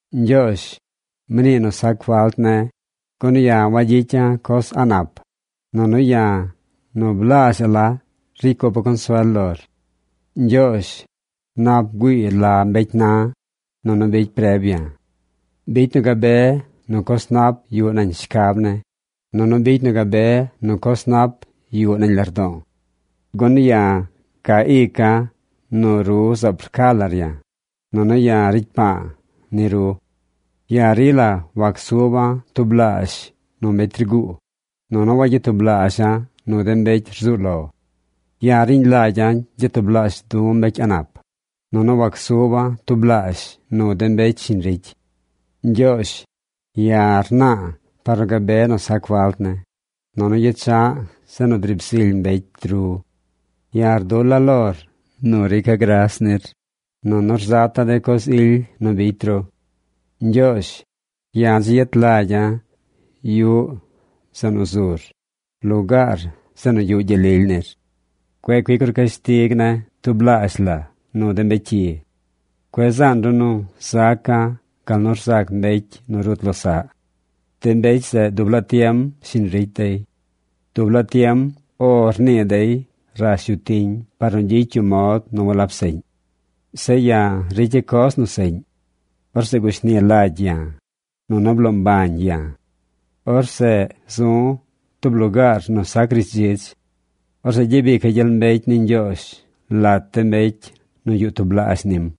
Ñgyoozh, mnii nu sac falt ne̱, gun ya̱ wagyicya̱ coz a̱ꞌ nap, nunu ya̱ nu blaazh la ricy cupa̱ consuel lor. Ñgyoozh, nap bgüii la mbecy na̱, nunu bicy preb ya̱. Bicy nu gabe nu coz nap yuꞌ nañ shcab ne̱, nunu bicy nu gabe nu coz nap yuꞌ nañ lardo̱o̱. Gun ya̱ ca ica̱ nu ru zaab rca lar ya̱, nunu ya̱ ricy pa̱a̱ ni ru. Ya̱ rila wacsuba̱ tublaazh nu mbecy rgu̱u̱, nunu wagyatublaazha̱ nu de mbecy rzuu lo. Ya̱ riñ lagya̱ gyatublaazh du̱ mbecy a̱ꞌ nap, nunu wacsuba̱ tublaazh nu de mbecy shiñ ricy. Ñgyoozh, ya̱ rna̱a̱ par nu gabe nu sac falt ne̱, nunu yecha̱ꞌ zeꞌ nu driib zily mbecy ru. Ya̱ rdula̱ lor nu rica̱ gras nir, nunu rzata̱ de coz ily nu bicy ru. Ñgyoozh, ya̱ dzi yet lagya̱ yuꞌ zeꞌ nu zur, lugaar zeꞌ nu yuꞌ gyel lily nir. Cueꞌ cuic ru cashtig ne̱ tublaazh la nu de mbecy cyi. Cueꞌ zaan ru nu zaca̱ gal nu rzac mbecy nu rut losaꞌ. De mbecy zeꞌ dub laa tiem shiñ ricy dey. Dub laa tiem “O” rnii dey rash yu tiñ par nu gyicy yu mod nu walab seꞌñ. Zeꞌ ya̱ ricya̱ coz nu seꞌñ. Orzeꞌ gushni lagy ya̱, nunu bloo mbañ ya̱. Orzeꞌ zu̱ tub lugaar nu sac rishdzidz. Orzeꞌ gyabica̱ gyel mbecy ni Ñgyoozh lat de mbecy nu yuꞌ tublaazh nim.